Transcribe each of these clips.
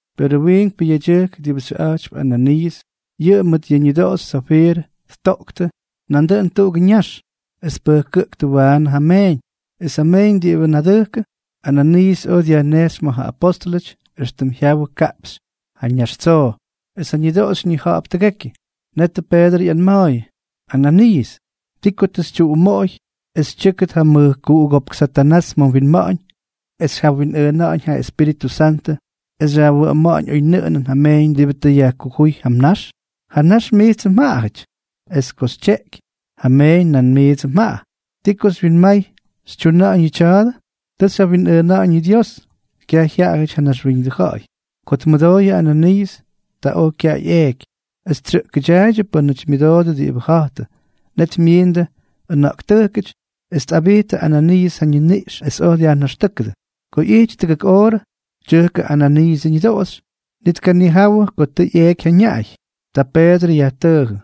Perʉ wiinkpʉ yedyʉjk diꞌibʉ xyʉꞌa̱jtypy Ananiiʉs, yʉꞌʉ mʉt ja ñʉdoꞌoxy Safiirʉ ttoꞌktʉ nandʉꞌʉn tuꞌugʉ ñax, es tpʉjkʉꞌktʉ waanʉ ja meeñ. Es ja meeñ diꞌibʉ nadʉjkʉ, Ananiiʉs oj dyajnejxy ma̱ ja apóstʉlʉty éxtʉm jyawʉ kaꞌpxy ja nax tsoo. Es ja ñʉdoꞌoxy ñija̱ꞌa̱p tʉgekyʉ. Netʉ Peedrʉ ꞌyanma̱a̱yʉ: —Ananiiʉs, ¿ti ko tʉ xytyuꞌumoꞌoy es tyʉ́kʉt ja mʉjkuꞌugópk Satanás ma̱ mwinma̱ꞌa̱ñ es xyjawinꞌʉʉna̱ꞌa̱ñ ja Espíritʉ Santʉ, es xyajwʉꞌʉma̱ꞌa̱ñ oynʉꞌʉnʉn ja meeñ diꞌibʉ tʉ yajkujúy ja mnax? Ja nax mijtsʉ mjaꞌa ijty. Es ko xytyeꞌky, ja meeñ nandʉꞌʉn mijts mjaꞌa. ¿Ti ko tʉ xywyinmay xytyuna̱ꞌa̱ñ yʉ tya̱a̱dʉ? Tʉ xyjawinꞌʉʉna̱ꞌa̱ñ yʉ Dios, kyaj jyaꞌajʉty ja naxwíñʉdʉ ja̱ꞌa̱y. Ko tmʉdooy yʉꞌʉ Ananiiʉs, ta oj kyaꞌay eeky. Es tsyʉꞌkʉdyaaydyʉ pʉ́nʉty myʉdoodʉ diꞌibʉ ja̱jtʉ. Net myiindʉ ʉna̱ꞌktʉjkʉty, es tꞌabijttʉ Ananiiʉs ja ñiniꞌx es oj dyajnaxtʉ́kʉdʉ. Ko ꞌyijty tʉgʉk oorʉ, tyʉjkʉ Ananiiʉsʉ ñʉdoꞌoxy, ni tkanijawʉ ko tʉ ꞌyeeky ja ñaꞌay. Ta Peedrʉ yajtʉʉjʉ: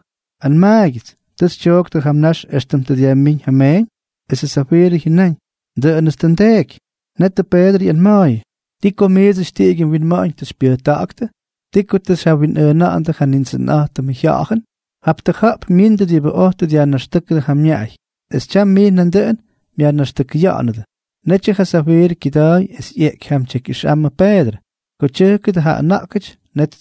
—Anmaagyʉts, ¿tʉ xytyooktʉ ja mnax éxtʉm tʉ dyajmíñ ja meeñ? Esʉ Safiirʉ jyʉnáñ: —Dʉꞌʉnʉts tʉ ndeeky. Netʉ Peedrʉ ꞌyanma̱a̱yʉ: —¿Ti ko miidsʉty tiꞌigyʉ mwinma̱ꞌa̱ñ tʉ xypyʉjta̱ꞌa̱ktʉ? ¿Ti ko tʉ xyjawinꞌʉʉna̱ꞌa̱ndʉ ja Nindsʉnꞌa̱jtʉmʉ Jya̱ꞌa̱jʉn? Jap tʉja̱ꞌp myindʉ diꞌibʉ oj tʉ dyajnaxtʉ́kʉdʉ ja mñaꞌay, es tyam mijts nandʉꞌʉn myajnaxtʉkʉya̱ꞌa̱nʉdʉ. Netyʉ ja Safiirʉ kyʉda̱a̱y es ꞌyeꞌky jam tyekyꞌʉjxmʉ Peedrʉ. Ko tyʉjkʉdʉ ja ʉna̱ꞌkʉty, net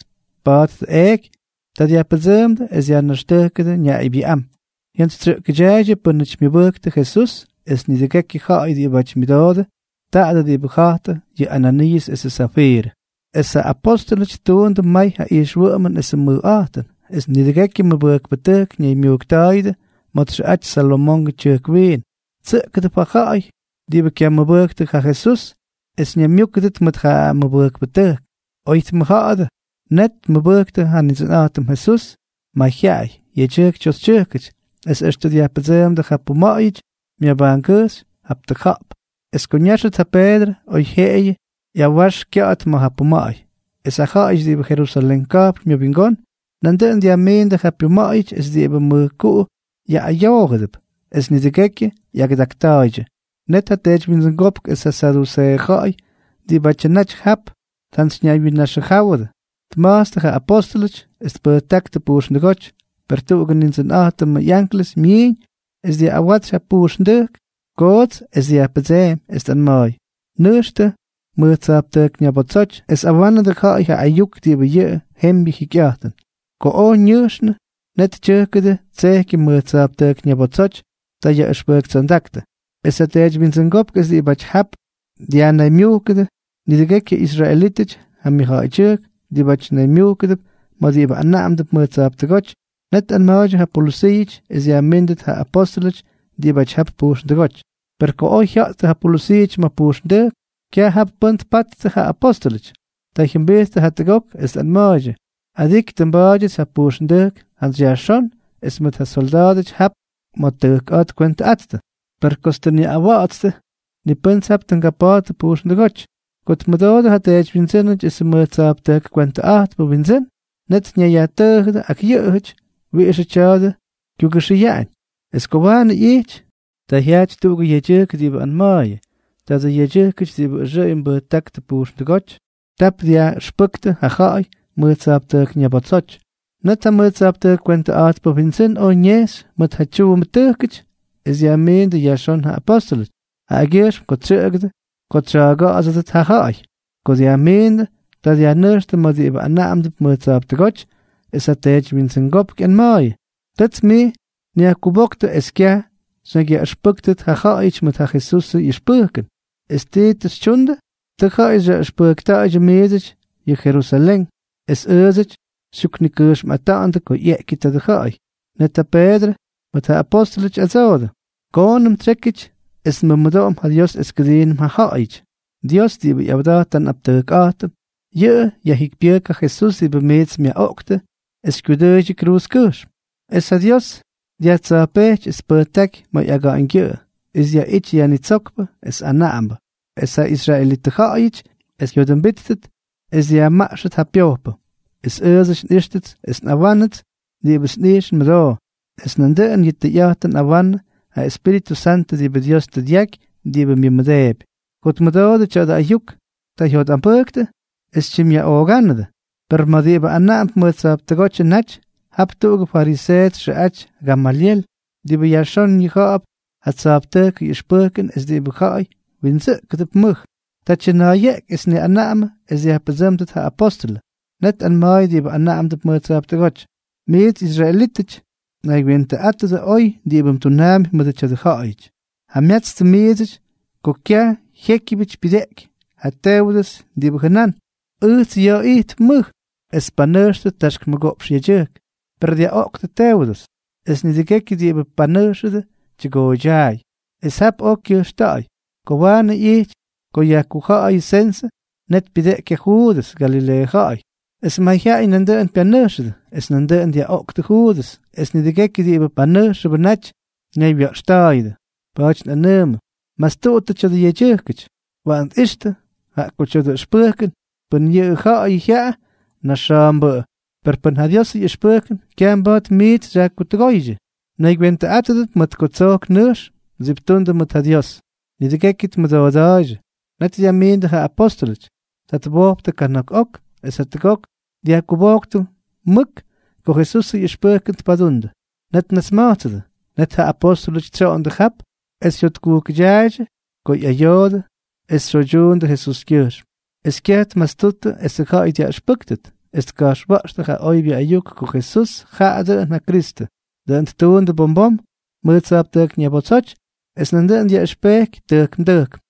tpattʉ eeky. Ta dyajpʉdsʉʉmdʉ es dyajnaxtʉjkʉdʉ ñaꞌaybyʉꞌám. Jyantsytsyʉꞌkʉdyaaydyʉ pʉ́nʉty myʉbʉjktʉ Jesús es nidʉgekyʉ ja̱ꞌa̱y diꞌibáty myʉdoodʉ tadʉ diꞌibʉ ja̱jtʉdʉ yʉ Ananiiʉs esʉ Safiirʉ. Es ja apóstʉlʉty ttuundʉ may ja ijxwʉꞌʉmʉn esʉ mʉjꞌa̱jtʉn. Es nidʉgekyʉ mʉbʉjkpʉtʉjk ñaymyujkta̱a̱yʉdʉ ma̱ txʉꞌaty Salomongʉ Tyʉjk Wiin. Tsʉꞌkʉdʉp ja ja̱ꞌa̱y diꞌibʉ kyamʉbʉjktʉ ja Jesús es ñaymyúkʉdʉt mʉʉt ja mʉbʉjkpʉtʉjk, oy tmʉjja̱ꞌa̱dʉ. Net tmʉbʉjktʉ ja Nindsʉnꞌa̱jtʉm Jesús mayjyaꞌay, yedyʉjk toxytyʉjkʉty. Es extʉ dyajpʉdsʉʉmdʉ ja puma̱ꞌa̱yʉty myabajngʉjxy jap tuꞌa̱jp, es ko ñáxʉt ja Peedrʉ, oyjyeꞌeyʉ ꞌyawax kya̱ꞌa̱t ma̱ ja puma̱ꞌa̱y. Es ja ja̱ꞌa̱yʉty diꞌibʉ Jerusalén ka̱jpn myʉwingón, nandʉꞌʉn dyajmiindʉ ja pyuma̱ꞌa̱yʉty es diꞌibʉ mʉjkuꞌu yaꞌꞌayoojʉdʉp, es nidʉgekyʉ ꞌyagʉdakta̱a̱ydyʉ. Net ja teedywyindsʉngópk es ja saduseeʉ ja̱ꞌa̱y diꞌibátyʉ naty jap tjantsyñaywyinnaxʉjáwʉdʉ, tma̱jtstʉ ja apóstʉlʉty es tpʉjtáktʉ pujxndʉgóty. Per tuꞌugʉ Nindsʉnꞌa̱jtʉmʉ ꞌyanklʉs myiiñ es dyaꞌꞌawatsy ja pujxndʉjk koots es dyajpʉdseemy, es tꞌanma̱a̱y: —Nʉjxtʉ mʉj tsa̱jptʉjk ñabotsoty, es awánʉdʉ ja̱ꞌa̱y ja ayuk diꞌibʉ yʉ jembyʉ jikyꞌa̱jtʉn. Ko oj xyʉʉñʉ, net tyʉjkʉdʉ tsejkyʉ mʉj tsa̱jptʉjk ñabotsoty. Ta yaꞌʉxpʉjktsondáktʉ. Es ja teedywyindsʉngópk es diꞌibáty jap dyajnaymyujkʉdʉ nidʉgekyʉ israelítʉty ja myʉjja̱ꞌa̱ydyʉjk diꞌibáty naymyujkʉdʉp ma̱ diꞌibʉ anaꞌamdʉp mʉj tsa̱jptʉgóty, net tꞌanma̱a̱ydyʉ ja polʉsiiʉty es dyajmíndʉt ja apóstʉlʉty diꞌibʉ jap pujxndʉgóty. Per ko oj jya̱ꞌttʉ ja polʉsiiʉty ma̱ pujxndʉjk, kyaj jap pʉ́n tpattʉ ja apóstʉlʉty. Ta jyʉmbijttʉ jatʉgok, es tꞌanma̱a̱ydyʉ: —Adiky tʉ nba̱a̱dyʉts ja pujxndʉjk jantsy yajxón es mʉt ja solda̱a̱dʉty jap ma̱ tʉjk a̱a̱ tkwentʉꞌattʉ, per kots tʉ nyaꞌꞌawa̱ꞌa̱tstʉ, ni pʉ́nʉts jap tʉ ngapa̱a̱ttʉ pujxndʉgóty. Ko tmʉdoodʉ ja teedywyindsʉ́nʉty esʉ mʉj tsa̱jptʉjk kwentʉꞌa̱jtpʉ wyindsʉ́n, net ñayyajtʉʉjʉdʉ ak yʉꞌʉjʉty wiꞌixʉ tya̱a̱dʉ kyugʉxʉyaꞌañ. Es ko waanʉ ꞌyijty, ta jyajty tuꞌugʉ yedyʉjk diꞌibʉ anma̱a̱yʉ: —Tadʉ yedyʉjkʉty diꞌibʉ ʉxʉꞌʉy mbʉjtáktʉ pujxndʉgóty, tap dyaꞌʉxpʉktʉ ja ja̱ꞌa̱y mʉj tsa̱jptʉjk ñabotsoty. Net ja mʉj tsa̱jptʉjk kwentʉꞌa̱jtpʉ wyindsʉ́n oj ñejxy mʉt ja tyuumbʉtʉjkʉty, es dyajmiindʉ yajxón ja apóstʉlʉty, jaꞌagyʉjxm ko tsyʉꞌʉgʉdʉ ko tsya̱a̱ga̱ꞌa̱dsʉdʉt ja ja̱ꞌa̱y. Ko dyajmiindʉ, ta dyajnʉjxtʉ ma̱ diꞌibʉ anaꞌamdʉp mʉj tsa̱jptʉgóty, es ja teedywyindsʉngópk ꞌyanma̱a̱yʉ: —Tʉts miits nyajkubóktʉ es kyaj xyñakyyaꞌʉxpʉ́ktʉt ja ja̱ꞌa̱yʉty mʉt ja Jesusʉ ꞌyʉxpʉjkʉn. ¿Es ti tʉ xytyundʉ? Tʉ ja̱ꞌa̱y xyaꞌʉxpʉjkta̱ꞌa̱ydyʉ miidsʉty ya̱ Jerusalén, es ʉʉdsʉty xytyuknikʉjxmꞌata̱ꞌa̱ndʉ ko ꞌyeꞌkyʉ tadʉ ja̱ꞌa̱y. Net ja Peedrʉ mʉt ja apóstʉlʉty ꞌyadsoodʉ: —Koonʉm tsyékyʉty es nmʉmʉdoꞌom ja Dios es kʉdiinʉm ja ja̱ꞌa̱yʉty. Dios diꞌibʉ ꞌyawda̱jt ja nꞌaptʉjkꞌa̱jtʉm, yʉꞌʉ yajjikypyʉjk ja Jesús diꞌibʉ miits myaꞌoꞌktʉ es xykyudʉʉydyʉ kruuzkʉjxm. Es ja Dios dyajtsa̱jpejty es tpʉjtáky ma̱ ꞌyaga̱ꞌa̱ñgyʉꞌʉ, es dyaꞌity Yajnitsókpʉ es Anaꞌambʉ, es ja israelitʉ ja̱ꞌa̱yʉty jyodʉmbíttʉt es yajmaꞌxʉt ja pyojpʉ. Es ʉʉdsʉty nꞌijxtʉts es nꞌawánʉts diꞌibʉts nꞌijx nmʉdoo, es nandʉꞌʉn yʉ tʉyꞌa̱jtʉn tꞌawanʉ ja Espíritʉ Santʉ diꞌibʉ Dios tʉ dyaky diꞌibʉ myʉmʉdeepy. Ko tmʉdoodʉ tya̱dʉ ayuk, ta jyotꞌambʉjktʉ es tyimꞌyaꞌoogándʉ. Per ma̱ diꞌibʉ anaꞌamdʉp mʉj tsa̱jptʉgótyʉ naty, jap tuꞌugʉ fariseeʉ txʉꞌaty Gamalyel, diꞌibʉ yajxón ñija̱ꞌa̱p ja tsa̱jptʉjkʉ ꞌyʉxpʉjkʉn es diꞌibʉ ja̱ꞌa̱y wyindsʉꞌkʉp mʉj. Ta tyʉna̱a̱yeꞌky es tniꞌanaꞌamʉ es dyajpʉdsʉ́mdʉt ja apóstʉlʉ. Net tꞌanma̱a̱y diꞌibʉ anaꞌamdʉp mʉj tsa̱jptʉgóty: —Miits israelítʉty, naygywentʉꞌátʉdʉ oy diꞌibʉ mdunaampy mʉdʉ tya̱dʉ ja̱ꞌa̱yʉty. Jamyatstʉ miidsʉty ko kyaj jyékyʉbyʉty pyʉdeꞌky yʉ Teudʉs diꞌibʉ jʉnán: “Ʉjts ya̱a̱ ijtp mʉj.” Es tpanʉjxtʉ taxk mʉgoꞌpxʉ yedyʉjk. Per dyaꞌoꞌktʉ Teudʉs, es nidʉgekyʉ diꞌibʉ panʉjxʉdʉ tyʉgooydyaay. Es jap oj kyʉjxta̱ꞌa̱y. Ko waanʉ ꞌyijty ko yajkuja̱ꞌa̱yʉ sensʉ, net pyʉdeꞌky ja Juudʉs, Galileeʉ ja̱ꞌa̱y, es mayjyaꞌay nandʉꞌʉn pyanʉjxʉdʉ. Es nandʉꞌʉn dyaꞌoꞌktʉ Juudʉs, es nidʉgekyʉ diꞌibʉ panʉjxʉbʉ naty ñaywya̱ꞌxta̱a̱yʉdʉ. Pa̱a̱ty nꞌanʉʉmʉ, mastuꞌuttʉ tya̱dʉ yedyʉjkʉty. Waꞌan tꞌixtʉ. Jaꞌa ko tya̱dʉ ʉxpʉjkʉn, pʉn yʉꞌʉ ja̱ꞌa̱yʉ jyaꞌa, naxa̱a̱mbʉꞌʉ, per pʉn ja Diosʉ ꞌyʉxpʉjkʉn, kyaj mba̱a̱t miits xyajtʉgóydyʉ. Mnaygywentʉꞌátʉdʉp, mʉt ko tsojk nʉjx mdsiptundʉ mʉt ja Dios. Nidʉgekyʉ tmʉdooda̱a̱ydyʉ. Net dyajmiindʉ ja apóstʉlʉty. Ta twojptʉ kana̱k ok es jatʉgok dyajkubojktʉ mʉk ko Jesusʉ ꞌyʉxpʉjkʉn tpaduunnʉ. Net tnasma̱jtsʉdʉ. Net ja apóstʉlʉty tsyoꞌondʉ jap es jyotkujkʉdyaaydyʉ ko ꞌyayoodʉ es tsyoydyuundʉ Jesuskyʉjxm. Es kyaj tmastuttʉ esʉ ja̱ꞌa̱y dyaꞌʉxpʉ́kʉt, es tka̱jxwa̱ꞌxtʉ ja oybyʉ ayuk ko Jesús jaꞌa dʉꞌʉn ja Kristʉ. Dʉꞌʉn ttuundʉ bom bom mʉj tsa̱jptʉjk ñabotsoty es nandʉꞌʉn dyaꞌʉxpejky tʉjkm tʉjkm.